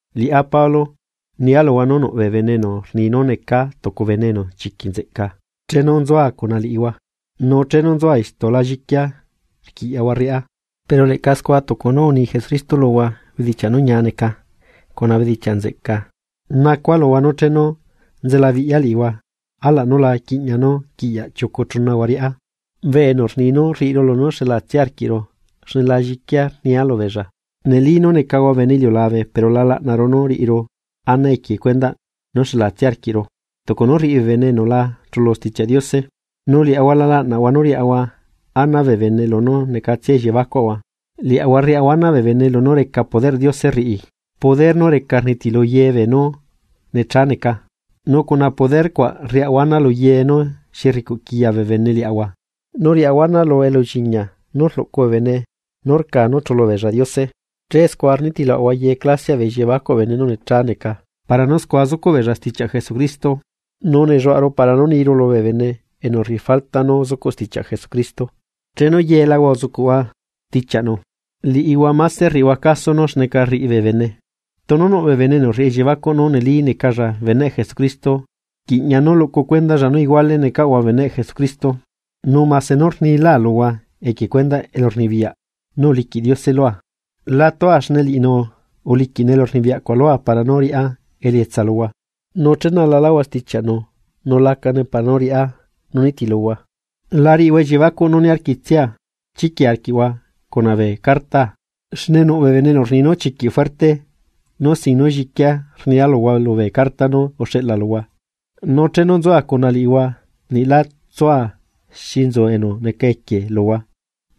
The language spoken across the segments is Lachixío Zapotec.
Liꞌá Pablo, nia luhua nú nuꞌ bee bene enu rni nú necaa tucu bene enu chiquiꞌ nzeꞌca chenu nzua cuna liꞌihua nu chenu nzucuaꞌa istu la lliquia rquiꞌyaꞌhua rriꞌa. Pero leꞌca scua tucu nú uni Jesucristo luhua bedichiaꞌ nú ñiá neca cuna bedichiaꞌ nzeꞌca nacua luhua nú chenu, nzelabiꞌya liꞌihua alaꞌ nú la quiꞌña nú quiꞌyaꞌ chiucu chunahua riꞌá, bee enu rni nú rriꞌiru lunú xelatsia arquiꞌru xne la lliquia nia lubeella. Neli nú necaꞌahua bene iliulabe pero la laꞌnaru nú riꞌiru ana equie cuendaꞌ nú xelatsia arquiꞌru tucu nú rriꞌi bee bene enu la chulu Stichiaꞌ Diose. Nu liaꞌahua la laꞌnaꞌahua nú riaꞌahua ana bee bene lunú necatsia elliebacuaꞌahua, liaꞌahua rriaꞌahua ana bee bene lunú reca poderꞌ Diose rriꞌi, poder nú reca rnitilu ye beenú necha neca. Nu cuna poder cuaꞌ riaꞌahua ana luye nú xi rricuꞌ quiya bee bene liaꞌahua nu rriaꞌahua ana lu elulliñia nú rluꞌcu bee bene nú rca nú chulu beella Diose. Che scua rnitiluaꞌahua ye clasiaꞌ bee elliebacuꞌ bee bene nú necha neca para nú scua zucuꞌ beella stichiaꞌ Jesucristo. Nu nelluaꞌaru para nú niru lubee bene enu rriꞌi falta nú zucuꞌ stichiaꞌ Jesucristo, chenu yelahua uzucuꞌhua stichiaꞌnu. Liꞌihua máse rriꞌihua caso nú xneca rriꞌi bee bene. Tunu nuꞌ bee bene enu rriꞌi elliebacuꞌ nú neli necalla beneꞌ Jesucristo, rquiꞌña nú luꞌcu cuendalla nú iguale necaꞌahua beneꞌ Jesucristo. Nu mase nú rnilaa luhua equie cuendaꞌ elurnibiyaꞌ nú uliquiꞌ Diose lua, la tua xne liꞌinu uliquiꞌnu elurnibiyaꞌcuaꞌ lua para nú riꞌá elietsa luhua, nú chenalaláhua stichiaꞌnu nu lacane para nú riꞌa nú nitiluhua. La riꞌihua elliebacuꞌ nú niarquitsia chiquia arquiꞌhua cuna bee cartaa. Xne nuꞌ bee enu rni nú chiquiꞌ fuerte nu sin nú lliquia rnia luhua lubee carta nú uxeꞌla luhua, nu chenu nzua cuna liꞌihua niꞌ la tsua xi su enu neca equie luhua,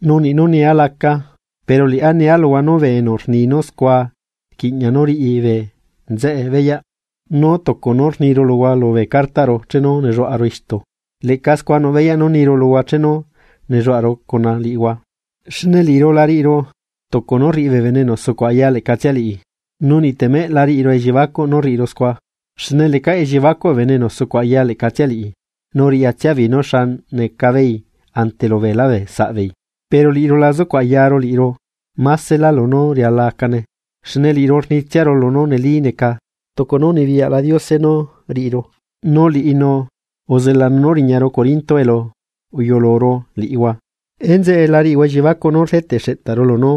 nu niꞌ nú niaa lacaa. Pero liꞌá nia luhua nú bee enu rni scua rquiꞌña nú riꞌi bee nzeꞌe beyaꞌ, nú tucu nú rniru luhua lubee cartaꞌru chenu nelluaꞌaru istu, leꞌca scua nuꞌ beyaꞌ nú niru luhua chenu nelluaꞌaru cuna liꞌihua. Xne liꞌiru la riꞌiru tucu nú rriꞌi bee enu sucuꞌ aya leꞌcatsia liꞌi. Nu niꞌtemeꞌ la riꞌiru elliebacuꞌ nú riꞌiru scua. Xne lecaꞌ elliebacuꞌ bee enu sucuꞌ aya leꞌcatsia liꞌi, nu riꞌyatsia beei nú xa necabeei ante lu beelá bee saꞌbeei. Pero liꞌiru la zucuꞌ ayaru liꞌiru másela lunú riala acane, xne liꞌiru rnitsiaru lunú neli neca tucu nú unibiyaꞌla Diose nú riꞌiru, nu liꞌinu uzelanu nú uriñaru corinto elu uyuluru liꞌihua. Enzeꞌe la riꞌihua elliebacuꞌ nu rdeteꞌ xeꞌtaru lunú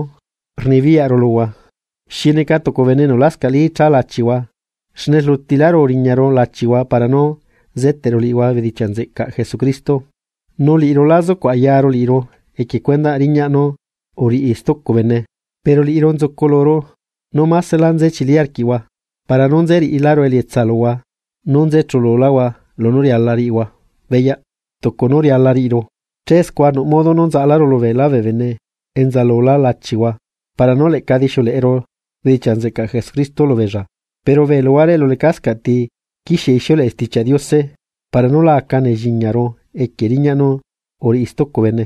rnibiyaꞌru luhua, xi neca tucu bene enu lascaꞌli cha lachihua xne rlutiláru uriñaru lachihua para nú zeteꞌru liꞌihua bedichiaꞌ nzeꞌcaꞌ Jesucristo. Nu liꞌiru la zucuꞌ ayaru liꞌiru equie cuendaꞌ riñaꞌ nú uriꞌi stucu bene. Pero liꞌiru nzuculuru nú másela nze chili arquiꞌhua, para nú nze riꞌiláru elietsaꞌhua nú nze chululáhua lunú riala riꞌihua beyaꞌ, tucu nú riala riꞌiru. Che scua nuꞌ modo nú nzaꞌaláru lubee lá bee bene enza lulá lachihua para nú leꞌca dixiuleꞌeru bedichiaꞌ nzeꞌcaꞌ Jesucristo lubeella. Pero bee luhuare elu lecascaꞌ ti quixie ixiuleꞌe Stichiaꞌ Diose para nú la aca nelliñiaru equie riñaꞌ nú uriꞌi stucu bene.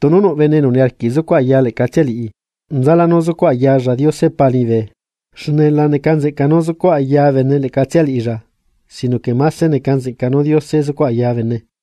Tunu nuꞌ bene enu niarquiꞌ zucuꞌ aya leꞌcatsia liꞌi, nzalá nú zucuꞌ ayalla Diose Pa liñibe. Xne la neca nzeꞌca nú zucuꞌ aya bene leꞌcatsia liꞌilla, sinoque máse neca nzeꞌca nú Diose zucuꞌ aya bene.